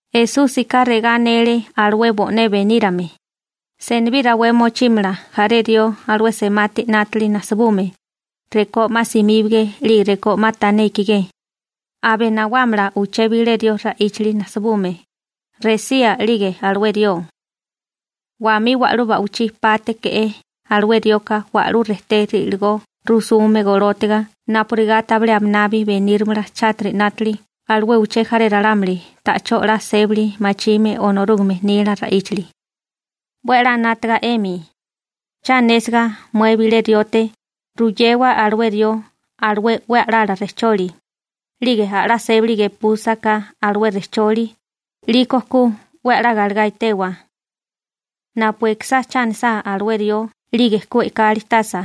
Esúsika regá anele alué bo'né benírame: ―Senibí rawé mochímala jaré rió alué semati 'nátili najsibume, rekó 'ma simíbage 'lige rekó 'ma tané ikigé, aba nawámala uché bilé rió ra'íchali najsibume, resía 'lige alué rió. Wamí wa'lú ba'wichí pátéke'é alué rioka wa'lú rejté ri'ligó rusume golótiga napurigá tabilé aminabi benírimala chátiri 'nátili alué uché jaré ralámuli ta'chó 'la sébali machime Onorúgame nila ra'íchali. ¡'We a'lá 'nátaga 'emi! › Cha anésiga mué bilé riote, ruyewa alué rió alué 'we a'lala rejcholi, 'lige a'lá sébali gepúsaká alué rejcholi, 'liko ku 'we a'lá galegá etewa. Napu ekisá cha anisá alué rió 'lige ku e'kali tasa,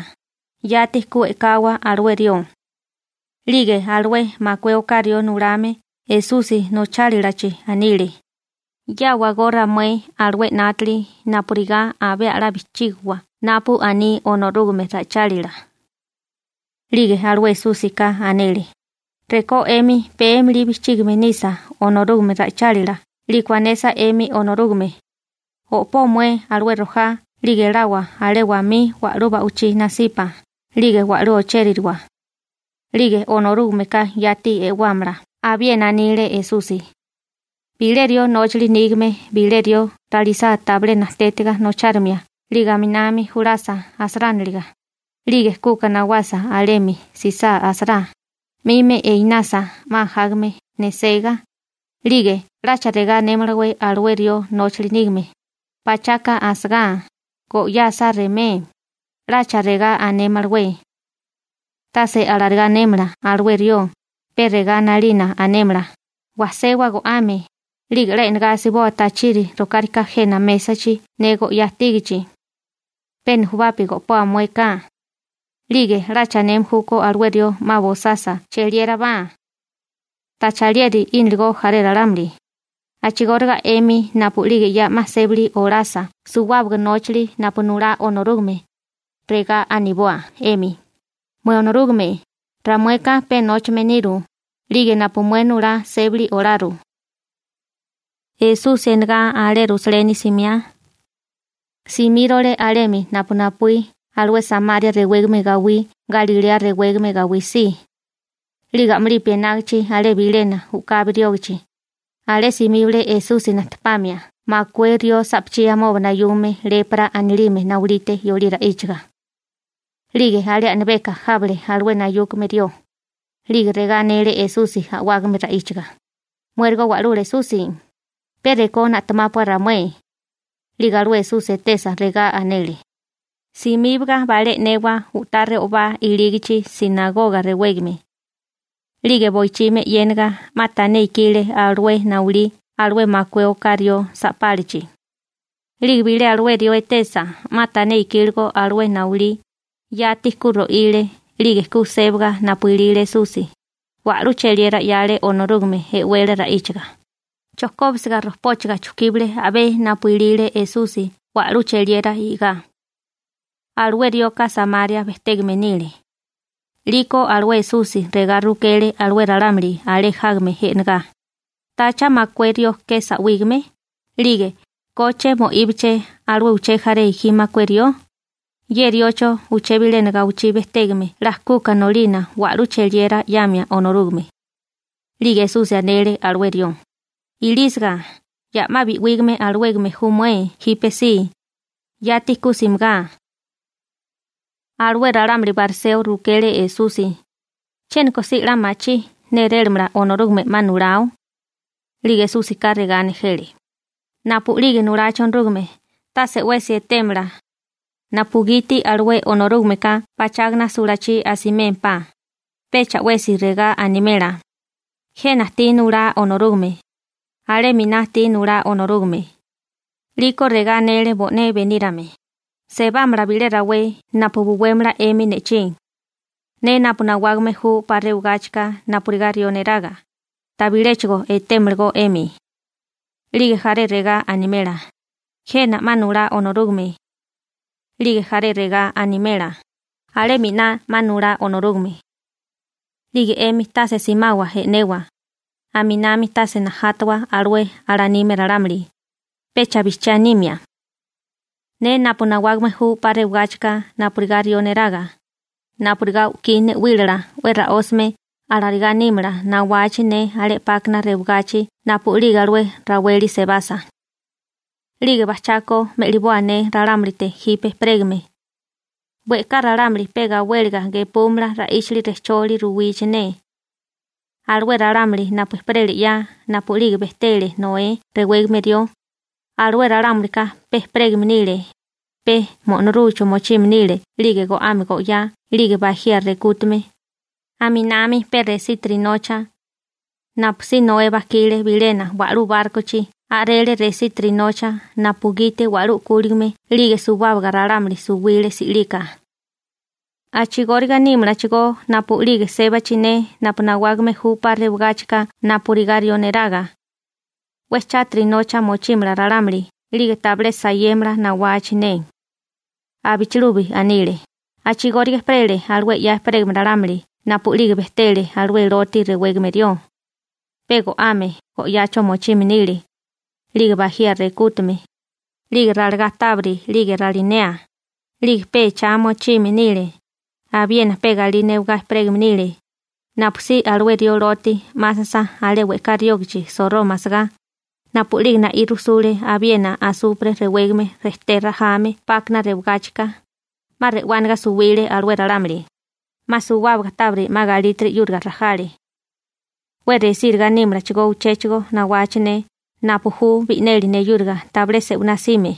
yati ku e'kawa alué rió. 'Lige alué makué oká rió nulame Esusi nochálilachi anile: ―'Yáwagó ramué alué 'nátili napurigá abé a'lá bijchígiwa napu aní Onorúgame ra'ichálila. 'Lige alué Esúsika anele: ―Rekó 'emi péemili bijchígame nisa Onorúgame ra'ichálila 'liko anesa 'emi Onorúgame: «O'pó mué alué rojá 'lige elawa alé wamí wa'lú ba'wichí nasipa 'lige wa'lú ochéririwa», 'lige Onorúgameka yati e'wámala. Abiena anile Esusi: ―Bilé rió nóchali nígame bilé rió ralisá tabilé najtétiga nochárimia 'lige 'minami julasa asarániliga, 'lige kuka nawasa alemi 'sisa asará, 'mimi einasa 'ma ajágame nesigá, 'lige ¿'lacha regá anémalawé alué rió nóchali nígame?: «Pachaka asagá, go'yá asá remé», ¿'lacha regá anémalawé? Tase alarigá anémala alué rió, pe regá 'nalina anémala: «Wajsewa go'ame, 'lige 'la e'negá asiboa tachiri rokárika jena mésachi ne go'yá ajtígachi. Pe nejubapi go'poa muéká.» 'Lige ¿'lacha aneme júkó alué rió 'ma bosasa cheliérabá? ¿Tacha alieri 'íniligo jaré ralámuli? › A'chigóriga 'emi napu'lige ya 'ma sébali olasa suwábaga nóchali napu nulá Onorúgame, regá aniboa 'emi: «Mué Onorúgame, ramueka pe nóchame niru, 'lige napu mué nulá sébali olaru.» Esusi enegá alé Rusaleni simiá, simírole alemi napu napuí alué Samaria rewégame gawí Galilea rewégame gawí si. 'Lige a'mulipi enágichi alé bilena u'kabi riógachi, alé simíbale Esusi najtepamia makué rió sa'pachí amoba nayume lepra anilime naulite yolí ra'íchaga. 'Lige alé a'nabeka jábale alué nayúkame rió, 'lige regá anele Esusi a'wágame ra'íchiga: ―¡Muérigo Wa'lula Esusi, pe rekó na'temápua ramué! 'Lige alué Esusi etesa, regá anele: ―Simíbaga balé e'newa u'tá re'obá ilígachi «sinagoga» rewégame. 'Lige boichimi eyéniga 'ma tané ikile alué naulí alué makué rió sa'pálachi. 'Lige bilé alué rió etesa 'ma tané ikíligo alué naulí, yati ku ro'ile, 'lige ku sébaga napu ilile Esusi, wa'lú cheliera 'yale Onorúgame e'wele ra'íchaga, chojkóbisiga rojpóchaga chujkíbale a'bé napu ilile Esusi wa'lú cheliera i'gá. Alué rioka Samaria bejtégame nile. 'Liko alué Esusi regá rukele alué ralámuli alé jágame e'negá: ―¿Tacha makué rió ke sa'wígame? 'Lige ¿koche mo'íbaleché alué uché jaré gi makué rió? Ye riocho uché bilena gawichí bejtégame 'la kuka nolina wa'lú cheliera 'yamia Onorúgame. 'Lige Esusi anele alué rió: ―Ilísiga, ya 'ma bi'wígame alawégame ju mué jípesí. Yati ku simigá. Alué ralámuli bariseo rukele Esusi: ―¿Chiéniko si 'la machí nérélamala Onorúgame 'ma nulao? 'Lige Esúsika regá nejele: ―Napu'lige nulachi Onorúgame, tase 'wesi etémala, napugiti alué Onorúgameka pachágana sulachí asimémpá, pecha 'wesi regá animela: «¡Jena ajtí nulá Onorúgame!» «¡Alé 'miná ajtí nulá Onorúgame!» 'Liko regá anele bo'né benírame: ―Sebámala bilé rawé napu buwémala 'emi ne'chí, ne napu nawágame ju 'pa rewagáchika napurigá rió neraga, tabiléchigo etémalagó 'emi. 'Lige jaré regá animela: «Jena 'ma nulá Onorúgame», 'lige jaré regá animela: «Alé 'miná 'ma nulá Onorúgame.» 'Lige 'emi tase simawa e'newa, aminami tase najátawa alué alanime ralámuli, pecha bijchiá nimia. Ne napu nawágame ju 'pa rewagáchika napurigá rió neraga, napurigá u'kí ne'wílala 'we ra'ósame alarigá nímala nawachi ne alé 'pákana rewagachi napu'lige alué raweli sebasa. 'Lige bajchako me'liboa ne ralámulite jipe ejperégame. We'ká ralámuli pe gawéliga gepúmala ra'íchali rejcholi ruwichi ne. Alué ralámuli napu ejperele 'ya napu'lige bejtele Noé rewégame rió, alué ralámulika pe ejperégame nile, pe mo'norúacho mochime nile 'lige go'ame go'yá 'lige bajía rekútame, aminami pe resítiri nocha. Napusí Noé bajkile bilena wa'lú bárkochi a'rele resítiri nocha napugiti wa'lú u'kúligame 'lige suwábaga ralámuli suwile si'lika. A'chigóriga nímalachigó napu'lige sébachi ne napu nawágame ju 'pa rewagáchika napurigá rió neraga. 'We chátiri nocha mochímala ralámuli 'lige tabilé sayémala nawachi ne. Abichilubi anile: ―A'chigóriga ejperele alué 'ya ejperégame ralámuli napu'lige bejtele alué Loti rewégame rió. Pe go'ame go'yacho mochime nile, 'lige bajía rekútume, 'lige ralagá tábiri 'lige ralinea, 'lige pe echá mochime nile, abiena pe galí newagá ejperégame nile, napusí alué rió Loti 'másasa alé we'ká riógachi Soroma asagá, napu'lige na'í rujsule abiena asupre rewégame rejté rajame 'pákana rewagáchika, 'ma re'wániga suwile alué ralámuli, 'ma suwábaga tábiri 'ma galítiri 'yúriga rajale. 'We resíriga nímalachigó uchéchigo nawachi ne napu ju bi'neli neyúriga tabilé se'winá 'sime.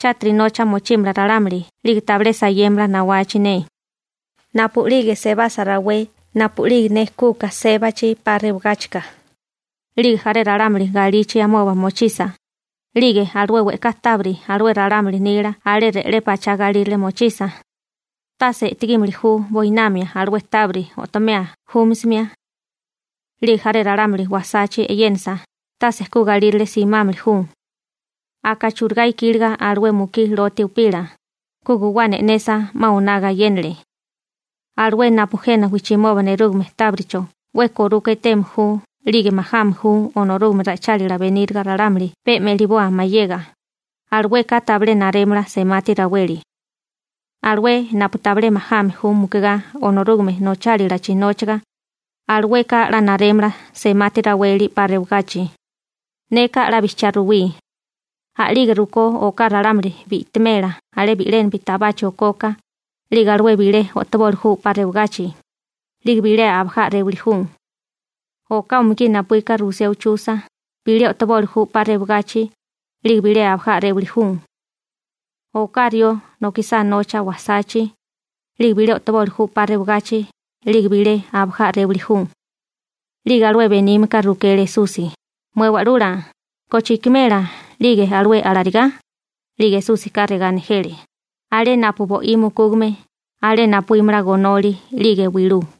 Chátiri nocha mochímala ralámuli 'lige tabilé sayémala nawachi ne. › Napu'lige sebasa rawé napu'lige ne kuka sébachi 'pa rewagáchika, 'lige jaré ralámuli galichi amoba mochisa, 'lige alué we'ká tábiri alué ralámuli nila alé re'lé pachá galírale mochisa, tase e'tegímili ju buinamia alué tábiri o'tomea júmisimia. 'Lige jaré ralámuli wasachi e'yénasa, tase ku galírale simámili ju. Aka churigá ikíliga'é alué mukí Loti upila, ku guwana e'nesa 'ma oná gayénale. Alué napu jena wijchimoba nerúgame tábiricho 'we koruka eteme ju 'lige majame ju Onorúgame ra'ichálila beníriga ralámuli pe me'liboa mayega, alueka tabilé narémala semati raweli. Alué napu tabilé majame ju mukigá Onorúgame nochálilachi nóchiga, alueka 'la narémala semati raweli 'pa rewagachi. › Neka 'la bijchiá ruwí. A'lige rukó oká ralámuli bi'timela alé bi'lénapi tabachi okoka, 'lige alué bilé o'toboli ju 'pa rewagachi, 'lige bilé abajá a'réwali ju. Oká umugí napuíka rusiá uchusa, bilé o'toboli ju 'pa rewagachi, 'lige bilé abajá a'réwali ju. Oká rió nokisá nocha wasachi, 'lige bilé o'toboli ju 'pa rewagachi, 'lige bilé abajá a'réwali ju. 'Lige alué benímeka rukele Esusi: ―Mué Wa'lula, ¿koche ikimela 'lige alué alarigá? 'Lige Esúsika regá nejele: ―Alé napu bo'í mukúgame, alé napuímala gonoli 'lige wilú.